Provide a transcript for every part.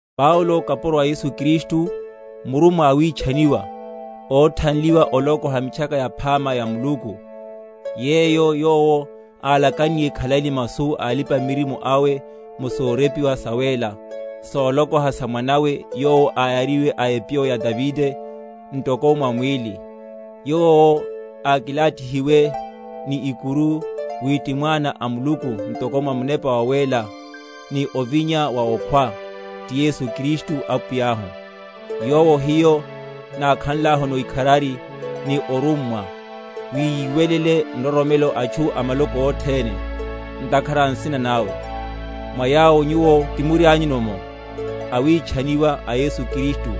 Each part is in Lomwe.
Paulo, kapuro a Yesu Kristu, murummwa awitchaniwa, óthanliwa olokoha Mitchaka Yaphama ya Muluku, yeyo Yowo alakanniye khalai ni masu a alipa‐miririmo awe mu sorepiwa sawéla, solokoha sa Mwana’we, yowo áyariwe, a epyo ya Davide, ntoko mwa mwíli. Yowo ákilathihiwe ni ikuru wi ti Mwana a Muluku ntoko mwa Munepa wa wéla, ni ovinya wa okhwa; ti Yesu Kristu Apwiyahu; Yowo hiyo nákhanlahuno ikharari ni orummwa, wi yiwelele nroromelo atchu a maloko othene, ntakhara a nsina nawe; mwa yawo nyuwo timurianyu’mo, awitchaniwa a Yesu Kristu;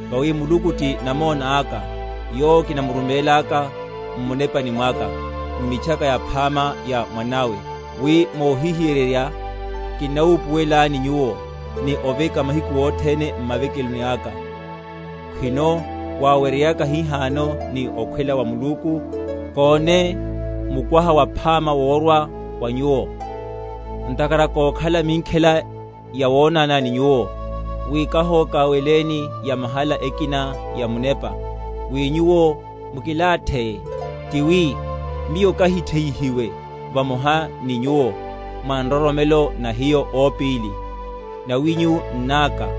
Vawi Muluku ti namona aka, yowo kinamurumélaka m’munepani mwaka, m’Mitchaka Yaphama ya Mwana’we, wi mohihiyererya kinnawupuwelani nyuwo, ni oveka mahiku othene m’mavekelo aka, khwino waweryeyaka hihano ni okhwela wa Muluku, kóne mukwaha waphama, worwa wa nyuwo. Ntakhara kókhala minkhela yawonana ni nyuwo, wi kahoka?-?weleni yamahala ekina ya munepa, wi nyuwo mukilatheye; ti wi, miyo kahitheyihiwe vamoha ni nyuwo, mwa nroromelo na hiyo ópíli, nawinyu n’náka.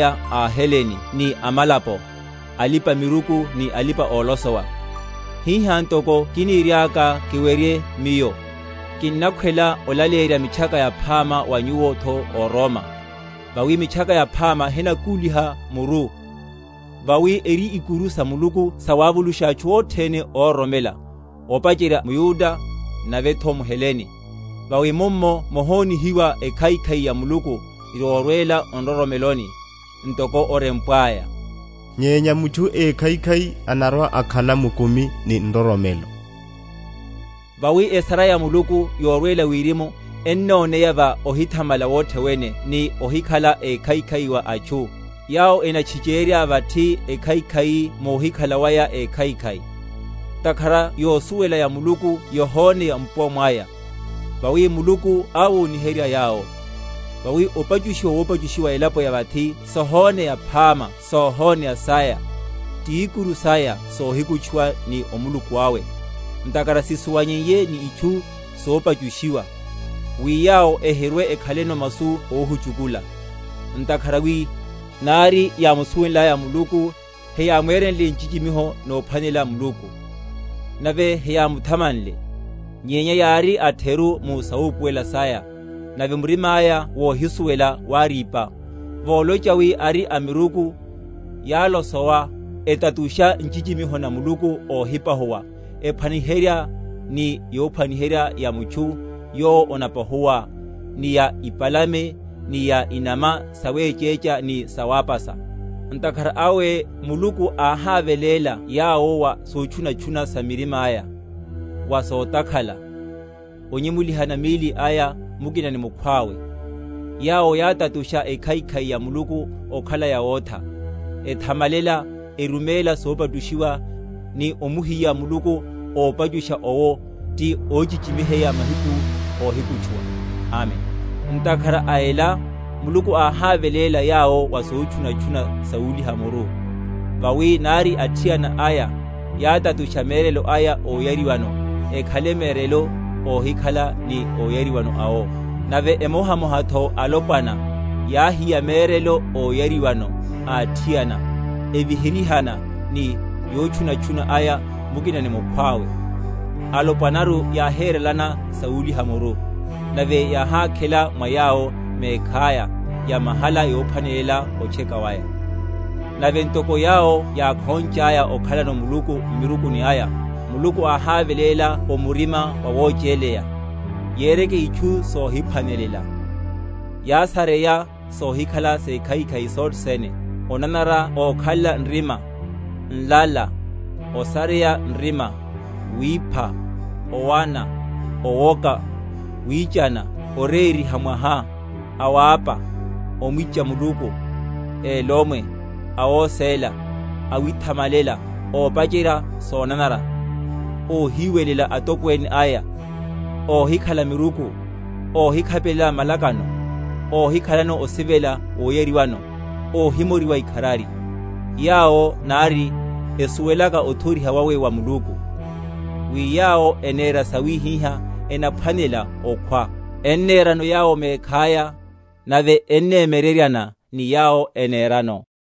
Miyo ka mulipa‐opoleya a aHelene ni a amalapo, a alipa‐miruku ni alipa‐olosowa. Hiha, ntoko kiniriaka kiwerye miyo, kinnakhwela olaleyerya Mitchaka Yaphama wa nyuwo’tho ó Roma. Vawi Mitchaka Yaphama henakúliha muru; vawi eri ikuru sa Muluku sawavulusha atchu othene óroromela; opacherya mYuda, navetho mHelene. Vawi mummo mohonihiwa ekhaikhai ya Muluku yorwela o nroromeloni: ntoko orempwaya, Nyenya mutchu ékhaikhai anarwa‐akhala mukumi ni nroromelo. Opahula waya wa amalapo. Vawi esara ya Muluku, yorwela wirimu, ennoneya va ohithamala wothe wene ni ohikhala ekhaikhai wa atchu, yawo enatchichérya vathi ekhaikhai múhikhala waya ékhaikhai; ntakhara yosuwela ya Muluku yohoneya mpuwa mwaya; vawi Muluku áwoniherya yawo. Vawi, opachushiwa wopachushiwa elapo ya vathi sohóneya phama sóhóneya saya, ti ikuru saya sohikutchuwa ni Omuluku awe; ntakhara sisuwanyeiye ni itchu sopachushiwa, wi yawo ehirwe‐ekhaleno masu óhuchukula; ntakhara wi, nari yámusuwenlaya Muluku, heyámwerenle nchichimiho nomphwanelela Muluku, nave heyámuthamanle; nyenya yári atheru mu sawupuwelela saya, nave murima aya wohisuwela wárípa. Volocha wi ari amiruku, yálosowa; etatusha nchichimiho na Muluku óhipahuwa, ephwaniherya ni yophwaniherya ya mutchu yowo onapahuwa, ni ya ipalame, ni ya inama sawéchécha, ni sawápasa. Ntakhara awe Muluku áháveléla yawo wa sotchunatchuna sa mirima’ya, wa sotakhala, onyemulihana míli aya mukina ni mukhwawe; yawo yátatusha ekhaikhai ya Muluku okhala yawótha, ethamalela, eruméla yopachushiwa, ni omuhiya Mulipa‐opachusha owo, ti óchichimiheya mahiku óhikutchuwa. Amen. Ntakhara a ela Muluku áháveléla yawo wa sotchunatchuna sawúliha muru: vawi nari athiana aya yátatusha merelo aya óyariwano ekhale merelo óhilikana ni óyariwano awo: nave emohamohatho alopwana yáhiya merelo óyariwano a athiana, eviherihana ni yotchunatchuna aya mukina ni mukhwawe, alopwanaru yáhérelana sawúliha muru, nave yáhákhela mwa yawo mekhaya yamahala yophwanela otcheka waya. Nave ntoko yawo yákhonchaya okhalano Muluku m’miruku aya, Muluku áháveléla o murima wawochéleya, yereke itchu sohiphwanelela; yásareya sohikhala sekhaikhai sothe sene, onanara, okhalela nrima, nlala, osareya nrima, wipha, owana, owoka, wíchana; orériha mwaha, awapa, omwicha Muluku, elomwe, awóséla, awithamalela, ópacherya sonanara, óhiwelela atokwene aya, óhikhala miruku, óhikhapelela malakano, óhikhalano osivela woyariwano, óhimoriwa ikharari; yawo nari esuwelaka othoriha wawe wa Muluku, wi yawo enera sawihiha enaphwanela okhwa, ennerano yawo mekhaya, nave ennemyereryana ni yawo enerano.